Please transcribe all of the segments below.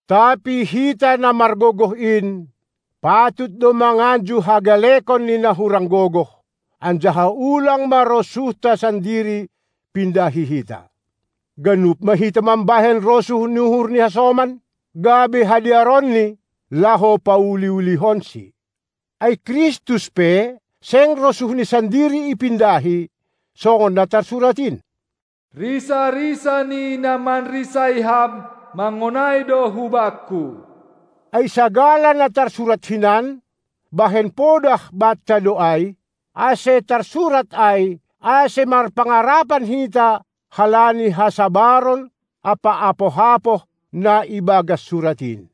Tapi hita na margogoh in, patut do manganju hagalekon ni na hurang gogoh, anjaha ulang ma rosuhta sandiri pindahi hita. Ganup ma hita mambahen rosuh ni uhur ni hasoman, gabe hadearonni, laho pauli-ulihonsi. Ai Kristus pe seng rosuhNi sandiri ipindahi, songon na tarsurat in: Risa-risa ni na manrisai Ham mangonai do hu-Bangku! Ai sagala na tarsurat hinan, bahen podah banta do ai, ase tarsurat ai, ase marpangarapan hita halani hasabaron ampa apoh-apoh na ibagas Surat in.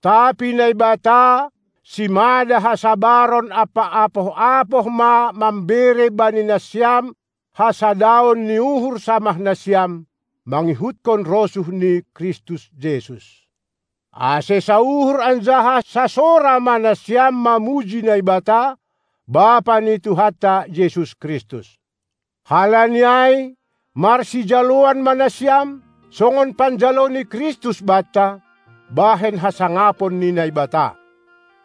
Tapi Naibata, simada hasabaron ampa apoh-apoh ma mambere bani nasiam hasadaon ni uhur samah nasiam mangihutkon rosuh ni Kristus Jesus, ase sauhur anjaha sasora ma nasiam mamuji Naibata, Bapa ni Tuhanta Jesus Kristus. Halani ai marsijaloan ma nasiam, songon panjalo ni Kristus banta, bahen hasangapon ni Naibata.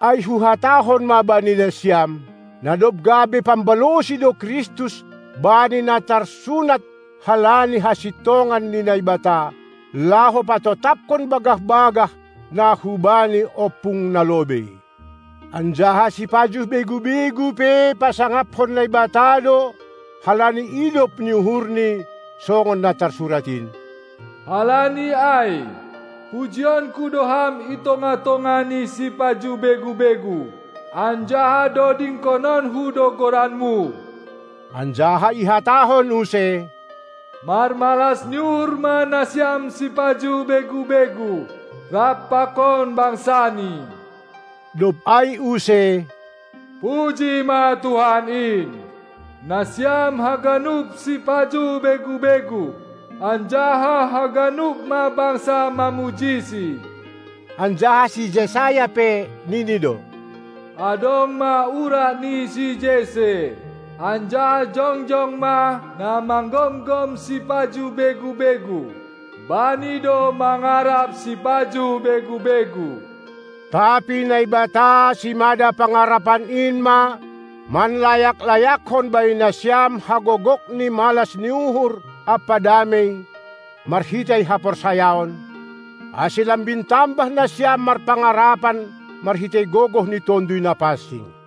Ai huhatahon ma bani nasiam, na dob gabe pambalosi do Kristus bani na tarsunat halani hasintongan ni Naibata, laho patotapkon bagah-bagah, na hubani ompung na lobei, anjaha sipajuh begu-begu pe pasangaphon Naibata do halani idop ni uhur-Ni, songon na tarsurat in: Halani ai pujionku do Ham itongah-tongah ni sipajuh begu-begu, anjaha dodingkononku do goran-Mu. Anjaha ihatahon use: Marmalas ni uhur ma nasiam sipajuh begu-begu rap pakon bangsaNi! Dob ai use: Puji ma Tuhan in, nasiam haganup sipajuh begu-begu, anjaha haganup ma bangsa mamujiSi. Anjaha si Jesayas pe, nini do: Adong ma urat ni si Jesse, anjaha jongjong ma na manggomgom sipajuh begu-begu. Bani do mangarap sipajuh begu-begu. Tapi Naibata, simada pangarapan in ma manlayak-layakhon bani nasiam hagogok ni malas ni uhur ampa damei marhitei haporsayaon, ase lambin tambah nasiam marpangarapan marhitei gogoh ni Tonduy Napansing.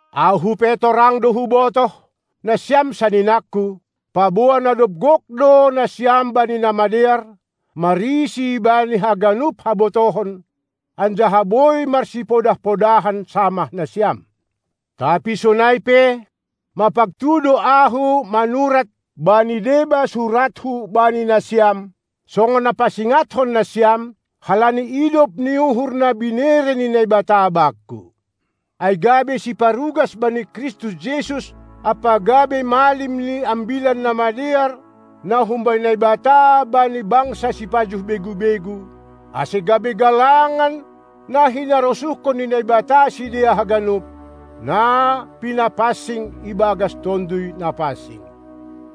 Ahu pe torang do hubotoh, nasiam saninangku, paboa na dob gok do nasiam bani na madear, marisi bani haganup habotohon, anjaha boi marsipodah-podahan samah nasiam. Tapi sonai pe, mapagtu do ahu manurat bani deba surathu bani nasiam, songon na pasingatkon nasiam, halani idop ni uhur na binere ni Naibata bakku, ai gabe siparugas bani Kristus Jesus ampa gabe malim ni Ambilan Namadear na humbani Naibata bani bangsa sipajuh begu-begu, ase gabe galangan na hinarosuhkon ni Naibata sidea haganup, na pinapansing ibagas Tonduy Napansing.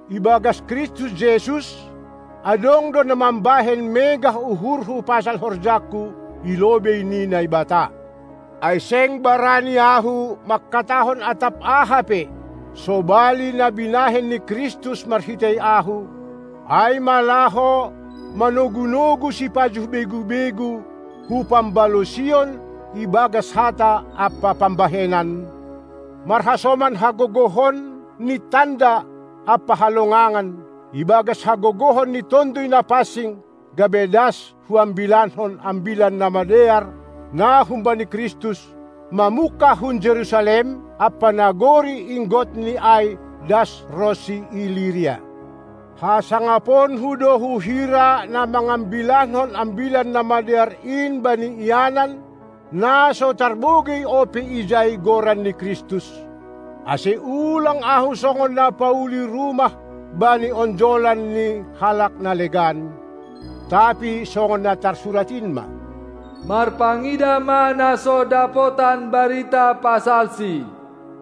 Ibagas Kristus Jesus, adong do na mambahen megah uhurhu pasal horjangku i lobei ni Naibata. Ai seng barani ahu, mangkatahon atap aha pe, sobali na binahen ni Kristus marhitei ahu, ai ma laho manogunogu sipajuh begu-begu, hu pambalosion ibagas hata ampa pambahenan, marhasoman hagogohon ni tanda ampa halongangan, ibagas hagogohon ni Tonduy Napansing, gabe das huambilankon Ambilan Namadear na humbani Kristus, mamungkah hun Jerusalem ampa nagori inggotni ai das ronsi Iliria. Hasangaponku do huhira na mangambilankon Ambilan Namadear in bani ianan, na so tarbogei ope ijai Goran ni Kristus, ase ulang ahu songon na pauli rumah bani onjolan ni halak na legan, tapi songon na tarsurat in ma: Marpangidah ma na so dapotan barita pasalsi,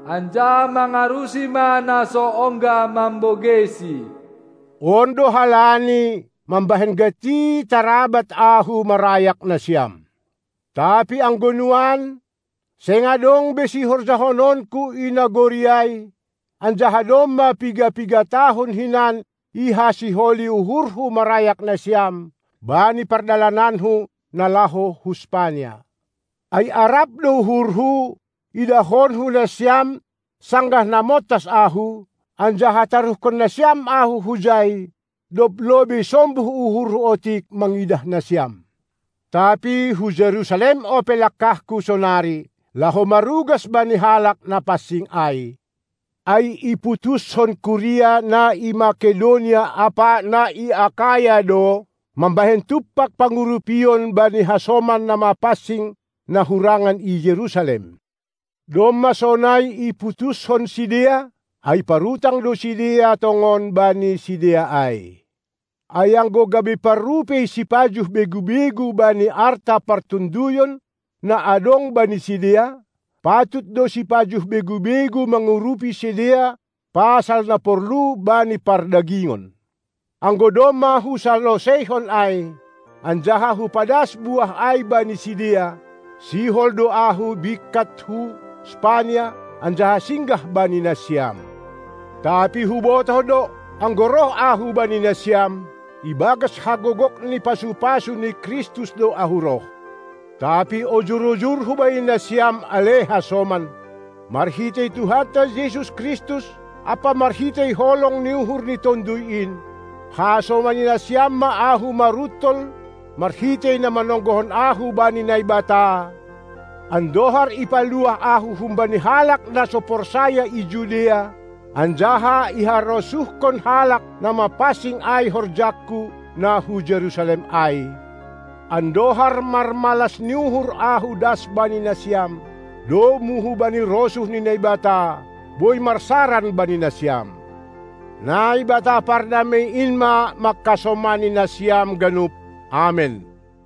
anjaha mangarusi ma na so ongga mambogeisi. On do halani mambahen gati tarabat ahu marayak nasiam. Tapi anggo nuan, seng adong be sihorjahononku i nagori ai; anjaha domma piga-piga tahun hinan ihasiholi uhurhu marayak nasiam, bani pardalananku na laho hu Spania. Ai arap do uhurhu, idahonku nasiam sanggah na montas ahu, anjaha taruhkonnasiam ahu hujai, dob lobei sombuh uhurhu otik mangidah nasiam. Tapi hu Jerusalem ope langkahku sonari, laho marugas bani halak na pansing ai, ai iputushon kuria na i Mekedonia ampa na i Akaya do, mambahen tumpak pangurupion bani hasoman na mapansing na hurangan i Jerusalem. Domma sonai iputuskon sidea, ai parutang do sidea tongon bani sidea ai. Ai anggo gabe parrupei sipajuh begu-begu bani arta partonduyon na adong bani sidea, patut do sipajuh begu-begu mangurupi sidea pasal na porlu bani pardagingon. Anggo domma husaloseihon ai anjaha hupadas buah ai bani sidea, sihol do ahu bingkat hu Spania, anjaha singgah bani nasiam. Tapi hubotoh do, anggo roh ahu bani nasiam, ibagas hagogok ni pasu-pasu ni Kristus do ahu roh. Tapi ojur-ojurhu bani nasiam, ale hasoman, marhitei Tuhanta Jesus Kristus ampa marhitei holong ni uhur ni Tonduy in: Hasomani nasiam ma ahu maruntol marhitei na manonggohon ahu bani Naibata, andohar ipaluah ahu humbani halak na so porsaya i Judea, anjaha iharosuhkon halak na mapansing ai horjangku na hu Jerusalem ai, andohar marmalas ni uhur ahu das bani nasiam, domu hubani rosuh ni Naibata, boi marsaran bani nasiam. Naibata Pardamei in ma mangkasomani nasiam ganup. Amen.